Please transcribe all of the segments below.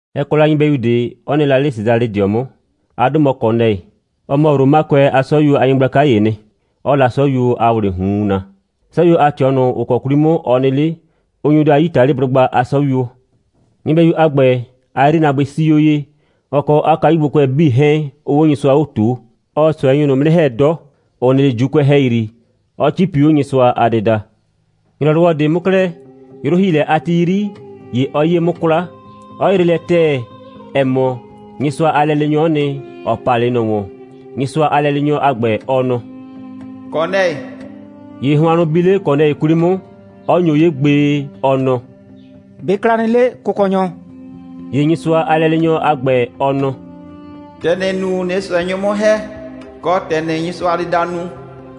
Ɛ kɔ la nyɩbɛyu ꞊de, 'ɔ nɩ la 'le Sesalɩdɩɔ 'mʋ. 'A 'dʋ mɔ Kɔnɛɩ. Ɔ mɔ Romakʋɛ a 'sɔyuo a nyɩgblaka ‑yee nɩ, 'ɔɔ la 'sɔyuo a ‑wlɩɩ ꞊hun naa. 'Sɔyuo a ꞊tɩɔ ꞊nʋ, ‑ɔ kɔ 'kwli 'mʋ ɔ nɩ 'le, ʋ nyo daa Yitaliblʋgba a 'sɔyuo. Nyɩbɛyu a ‑gbɛ, 'a 'yrinaabʋɩ 'sii 'o ye, ɔ kɔ 'a kayugbokʋɛ 'bii 'hɛɛn 'ʋʋ 'o Nyɩsʋa 'o ꞊tuu. Ɔɔ ꞊sʋɛnyʋ ꞊nʋ 'mʋ 'nɩ ‑hɛ 'dɔ, ‑ʋ nɩ 'le ‑Juukʋɛ ‑hɛyri, 'ɔ 'cipi 'o Nyɩsʋa a dɩda. ‑Nyrɔwɔ ꞊de 'mʋ 'klɛɛ, 'yrʋ‑hiilɛ a ti 'yri, ‑ye ɔ 'yee 'mʋ 'kwla, 'ɔ yree lɛ ‑tɛɛ, ‑ɛ mɔ, Nyɩsʋa a lɛleenyɔ'ɔ nɩ, ‑ɔ pa 'le ꞊nɔ ‑wɔn. Nyɩsʋa a lɛleenyɔ a ‑gbɛ, ɔ nɔ: «Kɔnɛɩ!» ‑Ye hʋannʋ bi 'le Kɔnɛɩ 'kwli 'mʋ, 'ɔ nyo 'ye gbee, ɔ nɔ: «꞊Be ɩ kla nɩ 'le, Kʋkɔnyɔ?» ‑Ye Nyɩsʋa a lɛleenyɔ a ‑gbɛ, ɔ nɔ: «‑Tɛ ‑nɩɩ nu, ꞊nɩɩ ꞊sʋɛnyʋ 'mʋ ‑hɛ, kɔ, ‑tɛ ‑nɩɩ Nyɩsʋa a dɩda nu,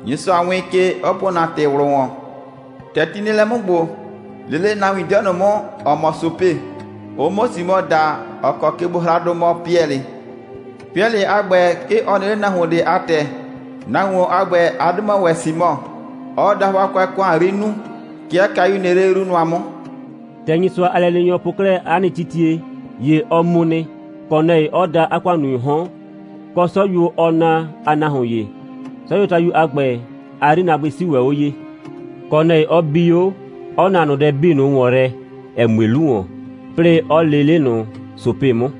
Nyɩsʋa wɩɩn ke, 'ɔ po ‑na ‑tɩ ꞊wlʋ ‑wɔn. ‑Tɛ ti nɩ lɛ 'mʋ ‑gbo, lee 'le nahuin 'dɩɔ ꞊nʋ 'mʋ, ‑ɔ mɔ Sope, ʋ 'mʋ Simɔ da, ‑ɔ kɔ kegbohraadʋ mɔ Piɛlɩ. Piɛlɩ a ‑gbɛ, 'ke ɔ nɩ 'le nahuon ꞊de a ‑tɛ. Nahuon a ‑gbɛ, 'a 'dʋ mɔ ‑wɛ Simɔ, 'ɔɔ dahʋakʋɛ ‑kʋan 'yri nuu. 'Ke 'a kayu nɩ 'le 'yru nʋa 'mʋ.» ‑Tɛ Nyɩsʋa a lɛleenyɔ po 'klɛɛ 'a nɩ titie, ‑ye ɔ mu nɩ, Kɔnɛɩ 'ɔ da 'a ‑kʋannunyʋʋ 'hɔn, kɔ 'sɔyuo, ɔɔ naa, a nahuon ‑ye. 'Sɔyuotayu a ‑gbɛ, 'a 'yrinaabʋɩ 'sii ‑wɛ 'o ye; Kɔnɛɩ 'ɔ bi 'o, 'ɔ na ꞊nʋ dɛ 'bii ꞊nʋ ‑wɔn yrɛ, ‑ɛ mue 'lu ‑wɔn, 'plɩɩ 'ɔ lee 'le ꞊nʋ Sope 'mʋ.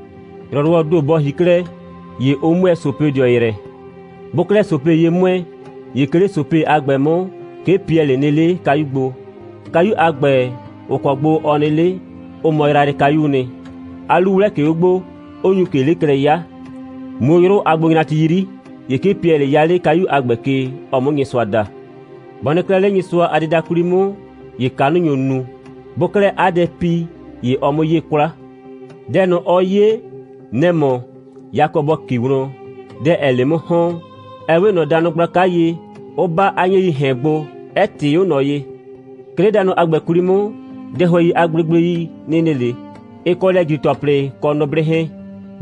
‑Nyrɔwɔɔ ‑do bɔ ‑hi 'klɛɛ, ‑ye ʋ 'mʋɛɛ Sopedɩɔ yrɛ. Bʋʋ 'klɛɛ Sope ye 'mʋɛɛ, ‑ye 'ke 'le Sope a ‑gbɛ 'mʋ, 'ke Piɛlɩ nɩ 'le kayu gbo. Kayu a ‑gbɛ, ‑ʋ kɔ gbo ɔ nɩ 'le, ʋ mɔ yrayrɩkayuu nɩ. 'A 'lu 'wlɛ ꞊ke 'o gbo, 'ʋ nyu ꞊ke 'le klɛ 'ya. Muu 'o 'yrʋ a gbonyrati 'yri, ‑ye 'ke Piɛlɩ 'ya 'le kayu a ‑gbɛ ke, ɔ 'mʋ Nyɩsʋa da. Bɔ nɩ 'klɛɛ 'le Nyɩsʋa a dɩda 'kwli 'mʋ, ‑ye kanʋ nyo nu. Bʋʋ 'klɛɛ 'a dɛ pi, ‑ye ɔɔ 'mʋ 'yee 'kwla. Dɛ ꞊nʋ, ɔɔ 'ye, nɛ‑ mɔ: yakɔ bɔ ‑ki wlɔn, dɛ 'ɛɛ 'le 'mʋ ‑hɔn, ‑ɛ 'we ꞊nɔ danʋ gblaka ye, 'ʋ 'ba 'a 'nyɛɛii ‑hɛn gbo, 'ɛ ꞊tɩɩ 'o ꞊nɔ ye. 'Ke 'le danʋ a ‑gbɛ 'kwli 'mʋ, dɛhʋɛi a gblegblei nɩ 'le, ɩ kɔ lɛ‑jri‑tɔplɩ kɔ nʋblɩ 'hɛɛn.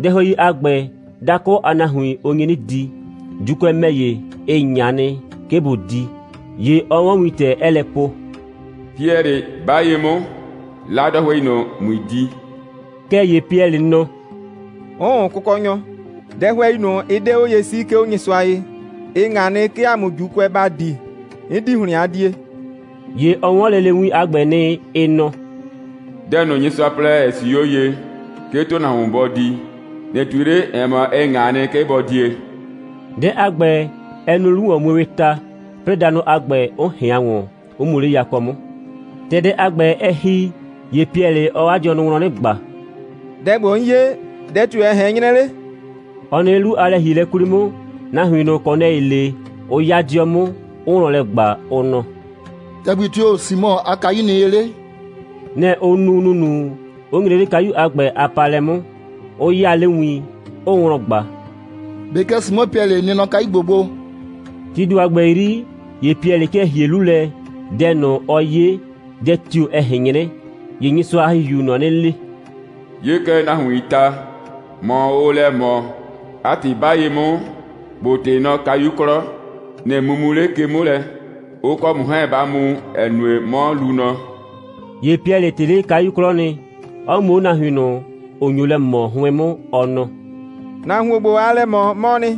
(Dɛhʋɛidʋ a ‑gbɛ, dakʋ a nahuin, ʋ nyi 'nɩ di, ‑Juukʋɛ ‑mɛ ‑ye, ɩ ꞊ŋa nɩ, 'ke bʋ di.) ‑Ye ɔ 'wɔn wintɛ, 'ɛɛ lɛ po: «Piɛlɩ, 'ba ye 'mʋ, 'la dɛhʋɛi ꞊nʋ, ꞊mui di.» Kɛɛ ‑ye Piɛlɩ nɔ: «'Ʋʋn, Kʋkɔnyɔ. Dɛhʋɛi ꞊nʋ, ɩ 'de 'o ye 'sii, 'ke 'o Nyɩsʋa ye. Ɩ ꞊ŋa nɩ, 'ke ‑a mʋ ‑Juukʋɛ ‑ba di. 'N 'di ‑hlɩn a die.» ‑Ye ɔ 'wɔn lele win a ‑gbɛ nɩ, ɩ nɔ: «Dɛ ꞊nʋ, Nyɩsʋa plɛ, ‑ɛ 'sii 'o ye, 'ke ‑tʋnahuon bɔ di, ꞊nɩ ꞊tui 'le, ‑ɛ mɔ, ɩ ꞊ŋa nɩ, 'ke bɔ die.» Dɛ a ‑gbɛ, ɛ nu 'lu‑wɔnmuewɩɩ ta, 'plɩɩ danʋ a ‑gbɛ, 'ʋ ꞊hɩan ‑wɔn, 'ʋ mu 'le yakɔ 'mʋ. ‑Tɛ dɛ a ‑gbɛ, ɛ ‑hi, ‑ye Piɛlɩ, ɔɔ 'a dɩɔnʋ wlɔn 'nɩ ꞊gba: «Dɛ ‑gbo, 'n 'ye, dɛ tio‑ ɛ ꞊hɛn 'nyrɛ 'le?» Ɔ nɩ 'le 'lu a lɛ‑hielɛ a ‑gbɛ 'kwli 'mʋ, nahuin ꞊nʋ, Kɔnɛɩ lee, 'ʋ 'ya 'dɩɔ 'mʋ, 'ʋʋ wlɔn lɛ ꞊gba, ʋ nɔ: «‑Tɛgbi tio‑ Simɔ a kayu nɩ ye 'le?» Nɛ‑ ʋ nu ‑nunu, 'ʋ nyre 'le kayu a ‑gbɛ a paalɛ 'mʋ, 'ʋ 'yaa 'le win, 'ʋʋ wlɔn ꞊gba: «꞊Be kɛ Simɔ Piɛlɩ nɩ nɔ kayu ‑gbo gbo?» Tii ‑do a ‑gbɛ 'yri, ‑ye Piɛlɩ 'kɩɛ ‑hie 'lu lɛ, dɛ ꞊nʋ, ɔ 'ye, dɛ tio‑ ɛ ꞊hɛn 'nyrɛ, ‑ye Nyɩsʋa a ‑Hihiuu ꞊nɔ 'nɩ le: «'Ye kɛ, nahuiin ta, ‑mɔ ʋʋ lɛ ꞊mɔ. 'A ‑tɩ, 'ba ye 'mʋ, ‑bo ꞊tɩ nɔ kayu 'klɔ, ꞊nɩ mumu 'le ke 'mʋ lɛ, ʋ kɔ ‑mʋ 'hɛɛn ba mu, ‑ɛ nue, 'mɔ luu nɔ.» ‑Ye Piɛlɩ ꞊tɩ 'le kayu 'klɔ nɩ, 'ɔ mu 'o nahuin ꞊nʋ, ‑ʋ nyo lɛ ꞊mɔ 'hʋɩn 'mʋ, ɔ nɔ: «Nahuon ‑gbo, aa lɛ ꞊mɔ, 'mɔɔ nɩ.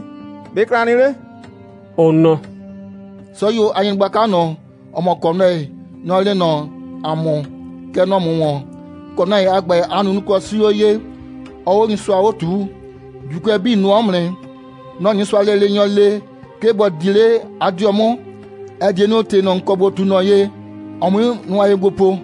꞊Be ɩ kla nɩ 'le?» Ʋ nɔ: «'Sɔyuo a nyɩgblaka ꞊nʋ, ‑ɔ mɔ Kɔnɛɩ, nɔ‑ lee nɔ ‑a mʋ, kɛ nɔ ‑mʋ ‑wɔn. Kɔnɛɩ a ‑gbɛ, 'a nunuklɔ 'sii 'o ye, 'ɔɔ 'o Nyɩsʋa 'o ꞊tuu. ‑Juukʋɛ 'bii nʋɔ 'mʋ nɩ. Nɔ‑ Nyɩsʋa a lɛleenyɔ le, 'ke ‑bo di 'le 'a 'dɩɔ 'mʋ, ‑ɛ die nu, ‑tɩ ꞊nʋ, ‑n kɔ ‑bo ꞊tu ꞊nɔ ye, ɔ 'mui nʋa ye gbo po.»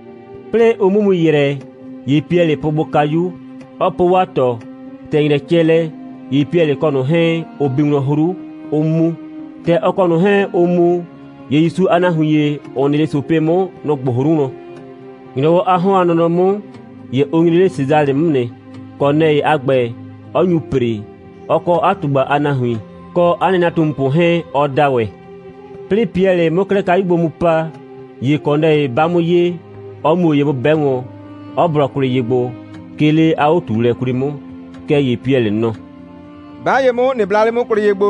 'Plɩɩ ʋ 'mʋ mu ‑yrɛ, ‑ye Piɛlɩ pʋʋ gbo kayu, 'ɔ po 'waa ꞊tɔ. ‑Tɛ ‑nyrɛ cɛ lɛ, ‑ye Piɛlɩ kɔ ꞊nʋ 'hɛɛn, ʋ bi wlɔn 'hru, 'ʋ mu. ‑Tɛ ɔ kɔ ꞊nʋ 'hɛɛn ʋʋ mu, ‑ye ‑Yusu a nahuin ‑ye, ‑ʋ nɩ 'le Sope 'mʋ, nʋ‑ gbʋ 'hru wlɔn. ‑Nyrɔwɔ a 'hɔn a nɔnɔ 'mʋ, ‑ye ʋ nyre 'le Sesalɩ 'mʋ nɩ, Kɔnɛɩ a ‑gbɛ, 'ɔ nyu ‑pre, ɔ kɔ 'a ꞊tugba a nahuin, kɔ 'a nɩnatumupʋ 'hɛɛn, ɔ da ‑wɛ. 'Plɩɩ Piɛlɩ 'mʋ 'klɛɛ kayu gbo mu pa, ‑ye Kɔnɛɩ 'ba 'mʋ ye, 'ɔ muo ye 'mʋ 'bɛ wɔn, 'ɔ blɔ kwlɩ ye gbo, 'ke 'le 'a 'o꞊tuulɛ 'kwli 'mʋ. Kɛɛ ‑ye Piɛlɩ nɔ: «'Ba ye 'mʋ, ꞊nɩ bla 'le 'mʋ kwlɩ ye gbo.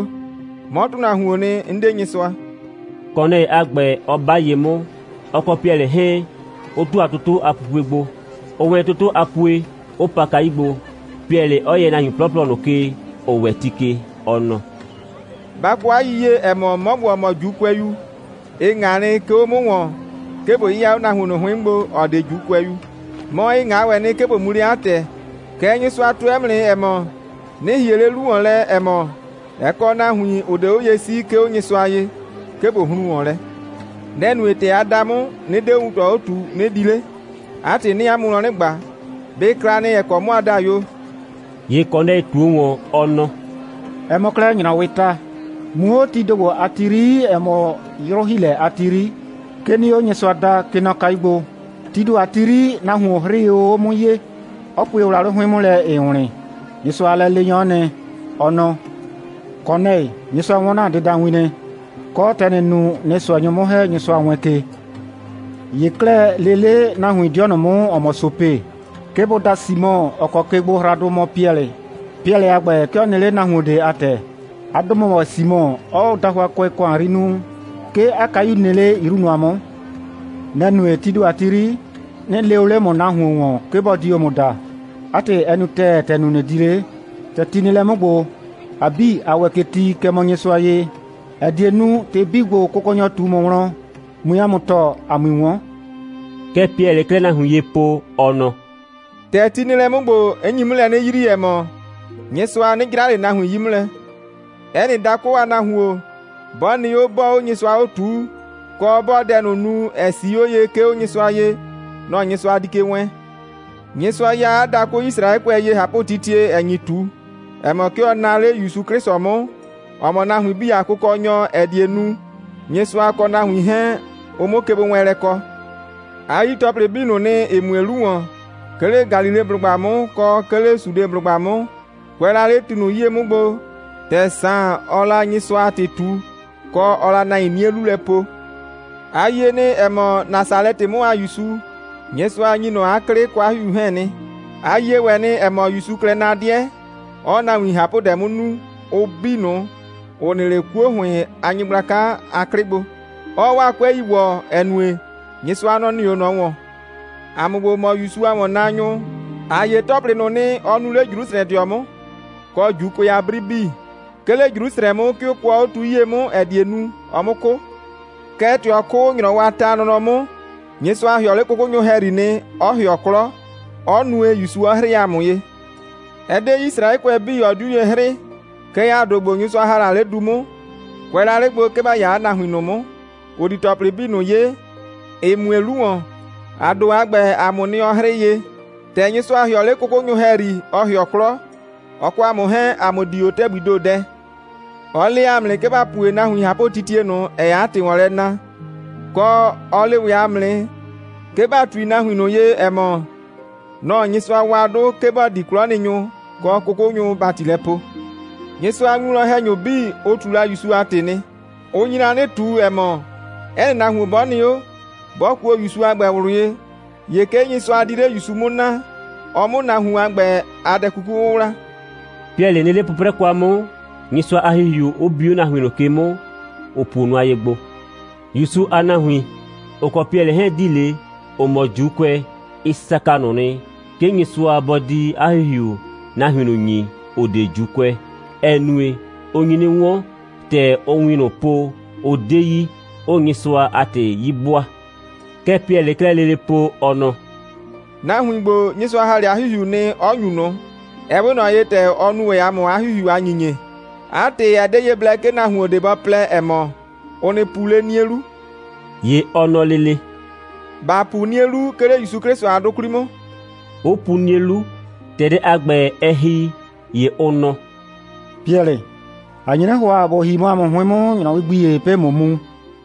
'Mɔ ‑tʋnahuoon nɩ. 'N 'de Nyɩsʋa,» Kɔnɛɩ a ‑gbɛ 'ɔ 'ba ye 'mʋ, ɔ kɔ Piɛlɩ 'hɛɛn, 'ʋ ‑tʋa toto a pupue gbo. Ʋʋ wɛn toto a pue, 'ʋ pa kayu gbo, Piɛlɩ 'ɔ yɛ nahuin 'plɔplɔ ꞊nʋ ke, ‑ʋ ‑wɛ ti ke, ɔ nɔ: «Ba kɔ 'a yiyie, ‑ɛ mɔ, 'mɔ ‑gbo, ‑ɔ mɔ ‑Juukʋɛyu, ɩ ꞊ŋa nɩ, 'ke 'o 'mʋ ‑wɔn, 'ke ꞊bo 'yɩya 'o nahuon ꞊nʋ 'hʋɩn 'mʋ gbo, ‑ɔ 'de ‑Juukʋɛyu. Mɔ, ɩ ꞊ŋa ‑wɛ nɩ, 'ke ꞊bo mu 'le 'a ‑tɛ. Kɛɛ, Nyɩsʋa tʋɛ 'mʋ nɩ, ‑ɛ mɔ, 'nɩ ‑hie 'le 'lu ‑wɔn lɛ, ‑ɛ mɔ, ɛ kɔ nahuin, ‑ʋ 'de 'o ye 'sii, 'ke 'o Nyɩsʋa ye, 'ke ꞊bo hrun ‑wɔn lɛ. Nɛ‑ nue, ‑tɛ a da 'mʋ, 'nɩ 'de 'o wuntɔ 'o ꞊tuu, 'nɩ di 'le. 'A ‑tɩ, 'nɩɩ 'a mʋ wlɔn 'nɩ ꞊gba, ꞊be ɩ kla nɩ, ‑ɛ kɔ 'mɔ a da yo?» ‑Ye Kɔnɛɩ ꞊tuo ‑wɔn, ɔ nɔ: «Ɛ mɔ 'klɛɛ ‑nyrɔwɩɩ ta, muu o 'o tii ‑do ‑gbo a ti 'yri, ‑ɛ mɔ 'yrʋ‑hiilɛ a ti 'yri, 'ke 'nɩɩ o Nyɩsʋa da, kɛ nɔ kayu gbo. Tii ‑do a ti 'yri, nahuon 'hrɩɩ o 'o 'mʋ ye, 'ɔ pue wlawlɩ 'hʋɩn 'mʋ lɛ, ‑ɩɩ wlɩn. Nyɩsʋa a lɛleenyɔ'ɔ nɩ, ɔ nɔ: Kɔnɛɩ, Nyɩsʋa 'wɔn ‑na dɩdawin nɩ, kɔ, ‑tɛ ‑nɩɩ nu, ꞊nɩɩ ꞊sʋɛnyʋ 'mʋ ‑hɛ, Nyɩsʋa wɛɛn ke. ‑Ye 'klɛɛ, lee 'le nahuin 'dɩɔ ꞊nʋ 'mʋ, ‑ɔ mɔ Sope, 'ke bʋ da Simɔ, ‑ɔ kɔ kegbohraadʋ mɔ Piɛlɩ. Piɛlɩ a ‑gbɛ, 'ke ɔ nɩ 'le nahuon ꞊de a ‑tɛ. 'A 'dʋ mɔ ‑wɛ Simɔ, 'ɔɔ dahʋakʋɛ ‑kʋan 'yri nuu. 'Ke 'a kayu nɩ 'le 'yru nʋa 'mʋ. Nɛ‑ nue, tii ‑do a ti 'yri, 'nɩ lee o 'le ‑mʋ nahuin ‑wɔn, 'ke bʋ di o ‑mʋ da. 'A ‑tɩ, ɛ nu ‑tɛɛ, ‑tɛ ‑n nu, ꞊nɩ di 'le. ‑Tɛ ti nɩ lɛ 'mʋ ‑gbo, ‑a 'bii, ‑a ‑wɛ ke ti, kɛ mɔ Nyɩsʋa ye, ‑ɛ die nu, ‑tɩ 'bii ‑gbo, Kʋkɔnyɔ ꞊tu ‑mʋ wlɔn, ꞊mui ‑a mʋ tɔɔ, ‑a 'mui 'wɔn.» Kɛ Piɛlɩɩ 'klɛɛ nahuin ye po, ɔ nɔ: «‑Tɛ ti nɩ lɛ 'mʋ ‑gbo, 'n nyi 'mʋ lɛ 'nɩ yrii, ‑ɛ mɔ, Nyɩsʋa 'nɩ 'jra ꞊le nahuin 'yi 'mʋ lɛ: 'Ɛ nɩ dakʋ a nahuon, 'bɔ nɩ 'o, 'bɔɔ 'o Nyɩsʋa 'o ꞊tuu, kɔ, 'bɔɔ dɛ ꞊nʋ nu, ‑ɛ 'sii 'o ye, 'ke 'o Nyɩsʋa ye, nɔ‑ Nyɩsʋa di ke wɛɛn. Nyɩsʋa ya 'a dakʋ Yisraɛkʋɛ ye ꞊hapʋtitie, ‑ɛ nyi ꞊tu, ‑ɛ mɔ, 'ke ɔ naa 'le ‑Yusu 'Klɩsʋ 'mʋ, ‑ɔ mɔ nahuin 'bii a Kʋkɔnyɔ, ‑ɛ die nu, Nyɩsʋa kɔ nahuin 'hɛɛn, ʋ 'mʋ kegbowɛɛnlɛ kɔ. A yi ‑tɔplɩ 'bii ꞊nʋ nɩ, ‑ɩ mue 'lu ‑wɔn, 'ke 'le Galileblʋgba 'mʋ, kɔ 'ke 'le Sudeblʋgba 'mʋ, kʋɛ la 'le ti ꞊nʋ 'yie 'mʋ gbo, ‑tɛ Saan, ɔɔ la Nyɩsʋa a ‑tɩ ꞊tu, kɔ, ɔɔ la nahuin 'nie 'lu lɛ po. A yie nɩ, ‑ɛ mɔ, Nasalɛtɩ 'mʋ a ‑Yusu, Nyɩsʋa ‑nyi ꞊nɔ 'a 'klɩ kɔ 'a ‑Hihiu 'hɛɛn nɩ. A yie ‑wɛ nɩ, ‑ɛ mɔ, ‑Yusuu klɛ na 'dɩɛ, 'ɔɔ nahuin ꞊hapʋdɛ 'mʋ nu, ʋ 'bii ꞊nʋ, ‑ʋ nɩ 'le 'kuo ‑hʋɩn a nyɩgblaka a 'klɩ gbo, 'ɔɔ 'waa 'kʋɛi ‑wɔ, ‑ɛ nue, Nyɩsʋa, nɔ‑ nɩ 'o ꞊nɔ ‑wɔn. ‑A mʋ ‑gbo, ‑ʋ mɔ ‑Yusu a ‑wɔnnaanyʋ, ‑a 'ye ‑tɔplɩ 'bii ꞊nʋ nɩ, ɔ nuu 'le Jrusrɛdɩɔ 'mʋ, kɔ ‑Juukʋɛ a 'bri 'bii. 'Ke 'le Jrusrɛ 'mʋ, 'ke ʋ kʋɔ 'o tu 'yie 'mʋ, ‑ɛ die nu, ɔ 'mʋ 'kʋ. Kɛɛ, ‑tɛ ɔ 'kʋ, ‑nyrɔwɔ a ta a nɔnɔ 'mʋ, Nyɩsʋa ‑hɩɔ 'le 'kʋkʋnyʋ ‑hɛyri nɩ, 'ɔ ‑hɩɔ 'klɔ, 'ɔ nue, ‑Yusu 'ɔ 'hrɩɩ ‑a mʋ ye. Ɛ 'de Yisraɛkʋɛ 'bii, ɔ 'diu ye 'hrɩɩ, kɛɛ, ‑a ‑do ‑gbo, Nyɩsʋa ‑ha la 'le du 'mʋ, kʋɛ la 'le gbo, 'ke ‑ba 'ya nahuin ꞊nʋ 'mʋ, ‑ʋ di ‑tɔplɩ 'bii ꞊nʋ 'ye, ‑ɩ mue 'lu ‑wɔn, ‑a ‑do a ‑gbɛ, ‑a mʋʋ nɩ, ɔ 'hrɩɩ ye. ‑Tɛ Nyɩsʋa ‑hɩɔ 'le 'kʋkʋnyʋ ‑hɛyri, ɔ ‑hɩɔ 'klɔ, ɔ kɔ ‑a mʋ 'hɛɛn, ‑a mʋ dii 'o ‑tɛgbii ‑do dɛ. Ɔ le ‑a mʋ nɩ, 'ke ‑ba pue nahuin ꞊hapʋtitie ꞊nʋ, ‑ɛɛ 'a ‑tɩ ‑wɔn lɛ na, kɔ, ɔ le ‑wɛ ‑a mʋ nɩ, 'ke ‑ba ꞊tui nahuin ye, ‑ɛ mɔ, nɔ‑ Nyɩsʋa wa 'dʋ, 'ke bɔ di 'klɔnɩnyʋ kɔ 'kʋkʋnyʋ ‑bati lɛ poo. Nyɩsʋa a winwlɔn‑hɛnyʋ 'bii, ʋ ꞊tu la ‑Yusu a ‑tɩ nɩ. Ʋ nyi la 'nɩ ꞊tu, ‑ɛ mɔ, 'ɛ nɩ nahuon 'bɔ nɩ 'o, 'bɔ kuo ‑Yusu a ‑gbɛ ꞊wlʋ ye, ‑ye 'ke Nyɩsʋa di 'le ‑Yusu 'mʋ naa, ɔ 'mʋ nahuon a ‑gbɛ a dɛ 'kuku 'wʋwla.» Piɛlɩ nɩ 'le 'pʋprɛ kwa 'mʋ, Nyɩsʋa a ‑Hihiu 'ʋ bi 'o nahuin ꞊nʋ ke 'mʋ, ‑ʋ puo nʋa ye gbo. ‑Yusu a nahuin, ‑ʋ kɔ Piɛlɩ 'hɛɛn‑ di 'le, ‑ʋ mɔ ‑Juukʋɛ, ɩ saka ꞊nʋ nɩ, 'ke Nyɩsʋa bɔ di 'a ‑Hihiu nahuin ꞊nʋ ‑nyi, ‑ʋ 'de ‑Juukʋɛ, ‑ɛ nue, ʋ nyi 'nɩ 'wɔn, ‑tɛ ʋʋ win ꞊nʋ po, ʋ 'de yi, 'ʋʋ Nyɩsʋa a ‑tɩ 'yi 'bʋaa. Kɛ Piɛlɩɩ 'klɛɛ lele po, ɔ nɔ: «Nahuin ‑gbo, Nyɩsʋa ‑ha 'le 'a ‑Hihiu nɩ, 'ɔ ‑nyu ꞊nʋ, ɛ 'we ꞊nɔ ye, ‑tɛ ɔ nu ‑wɛ ‑a mʋ 'a ‑Hihiu a ‑nyinyie. 'A ‑tɩ, ɛ 'de ye blɛ, 'ke nahuon ꞊de bɔ plɛ, ‑ɛ mɔ, ʋ nɩ pu 'le 'nie 'lu.» ‑Ye ɔ nɔ lele: «‑Ba pu 'nie 'lu, 'ke 'le ‑Yusu 'Klɩsʋ a 'dʋ 'kwli 'mʋ!» 'ʋ pu 'nie 'lu. ‑Tɛ dɛ a ‑gbɛ, ɛ ‑hi, ‑ye ʋ nɔ: «Piɛlɩ, ‑a nye 'nɩ ‑hʋa, ‑bo ‑hi mɔ ‑a mʋ 'hʋɩn 'mʋ ‑nyrɔwɩ gbi ‑ye, 'plɩɩ ꞊mʋ mu.»